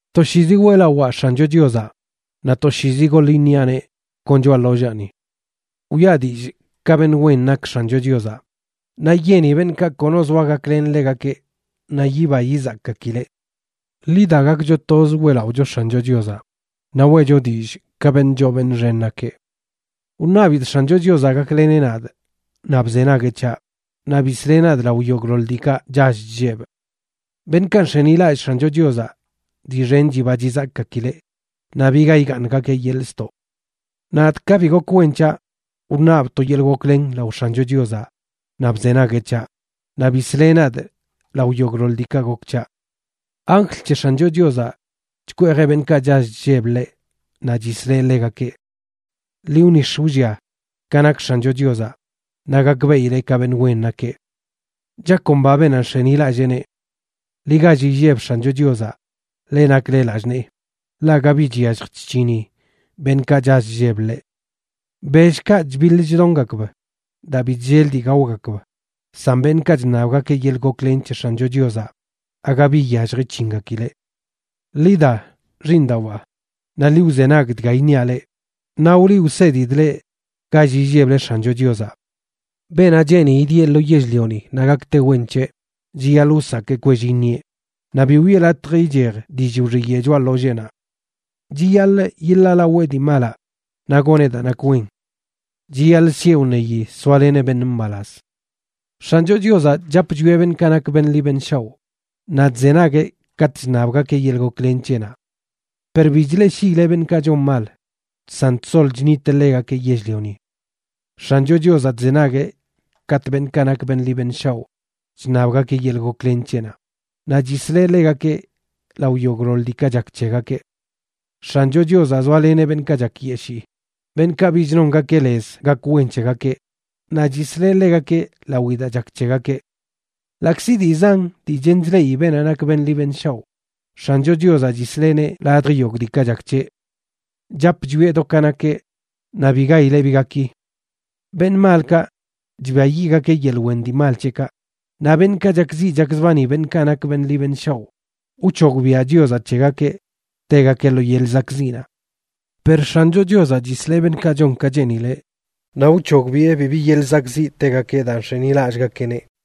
Toshiizi weꞌlawaa X̱ancho Chiozaꞌ, naꞌ toshiizi goḻ iṉiaꞌneꞌ kon choꞌa ḻollaani. Wiꞌa dillꞌ ka beṉꞌ wen nak X̱ancho Chiozaꞌ, naꞌ yeni beṉꞌkaꞌ kono zoa gaklen ḻegakeꞌ naꞌ yiba yizakgakileꞌ. Ḻi da, gakcho toz weꞌlaꞌocho X̱ancho Chiozaꞌ, naꞌ weꞌcho dillꞌ ka beṉꞌ choo beṉꞌ xen nakeꞌ. Wṉabidꞌ X̱ancho Chiozaꞌ gakleneꞌ nadꞌ, naꞌ bzenagueꞌ c̱haꞌ, naꞌ bisleꞌ nadꞌ lao yogꞌḻoḻ diikaꞌ chall chllebꞌ. Beṉꞌkaꞌ nx̱enilallꞌ X̱ancho Chiozaꞌ dii xen chiba chizakꞌgakileꞌ, naꞌ biga igaaṉgakeꞌ yeḻꞌ ztoꞌ. Nadꞌ ka bi gok wen c̱haꞌ, wṉabꞌ to yeḻꞌ goklen lao X̱ancho Chiozaꞌ naꞌ bzenagueꞌ c̱haꞌ, naꞌ bisleꞌ nadꞌ lao yogꞌḻoḻ diikaꞌ gok c̱haꞌ. Anjl c̱he X̱ancho Chiozaꞌ chkweejeꞌ beṉꞌkaꞌ chall chlleb ḻeꞌ naꞌ chisleꞌ ḻegakeꞌ. Ḻi wnix̱ wllia ka nak X̱ancho Chiozaꞌ, naꞌ gakbeꞌile ka beṉꞌ wen nakeꞌ. ¡Chakomba beenaꞌ nx̱enilalleeneꞌ! Ḻi gall illeb X̱ancho Chiozaꞌ, leꞌ nakle lallꞌ nee, ḻaꞌ aga bi chyallj chc̱hini beṉꞌkaꞌ chall chlleb ḻeꞌ. Bellkaꞌ chbiḻ chdongakb daa bi chllel dii gaogakb, san beṉꞌkaꞌ chṉabgakeꞌ yeḻꞌ goklen c̱he X̱ancho Chiozaꞌ aga bi iyallj ic̱hingakileꞌ. Ḻi da, xiiṉdawaa, naꞌ ḻi wzenag dga iṉiaꞌ leꞌ, naꞌ wliꞌ wsedidꞌ leꞌ gall illeble X̱ancho Chiozaꞌ. Beenaꞌ cheeni idieꞌ lo yell-lioni naꞌ gakte wen c̱heꞌ, chiyaḻꞌ wsakee kwell iṉieꞌ, naꞌ bi wiꞌe latj ichej dillꞌ wxiyeꞌ choꞌa ḻolleenaꞌ. Chiyaḻꞌ yiḻaalawee dii malaꞌ, naꞌ goneꞌ daa nak wen. Chiyaḻꞌ sieꞌ wṉeyi soaleneꞌ beṉꞌ mbalaz. X̱ancho Chiozaꞌ chap chwieꞌ beṉꞌkaꞌ nak beṉꞌ ḻi beṉꞌ shaoꞌ, naꞌ chzenagueꞌ katꞌ chṉabgakeꞌ yeḻꞌ goklen c̱heꞌnaꞌ. Per bi chleꞌshiileꞌ beṉꞌkaꞌ chon mal, san chsol chṉiteꞌ ḻegakeꞌ yell-lioni. X̱ancho Chiozaꞌ chzenagueꞌ katꞌ beṉꞌkaꞌ nak beṉꞌ ḻi beṉꞌ shaoꞌ chṉabgakeꞌ yeḻꞌ goklen c̱heꞌnaꞌ, naꞌ chisleꞌ ḻegakeꞌ lao yogꞌḻoḻ diikaꞌ chak c̱hegakeꞌ. X̱ancho Chiozaꞌ zoaleneꞌ beṉꞌkaꞌ chakyeshii, beṉꞌkaꞌ bich nongakeꞌ lez gak wen c̱hegakeꞌ, naꞌ chisleꞌ ḻegakeꞌ lawi daa chak c̱hegakeꞌ. Ḻaꞌkzi dii zan dii chen chleꞌi beenaꞌ nak beṉꞌ ḻi beṉꞌ shaoꞌ, X̱ancho Chiozaꞌ chisleꞌneꞌ ladj yogꞌ diikaꞌ chak c̱heꞌ. Chap chwieꞌ do ka nakeꞌ, naꞌ bi gaileꞌ bi gaki. Beṉꞌ malkaꞌ, chbiayiꞌgakeꞌ yeḻꞌ wen dii mal c̱heꞌkaꞌ; naꞌ beṉꞌkaꞌ chakziꞌ chakzbani beṉꞌkaꞌ nak beṉꞌ ḻi beṉꞌ shaoꞌ, wc̱hogbiaꞌ Chiozaꞌ c̱hegakeꞌ tegakeꞌ lo yeḻꞌ zakꞌziꞌnaꞌ. Per X̱ancho Chiozaꞌ chisleꞌ beṉꞌkaꞌ chon ka cheenileꞌ, naꞌ wc̱hogbiꞌe bibi yeḻꞌ zakꞌziꞌ tegakeꞌ daa nx̱enilallꞌgakeꞌneꞌ.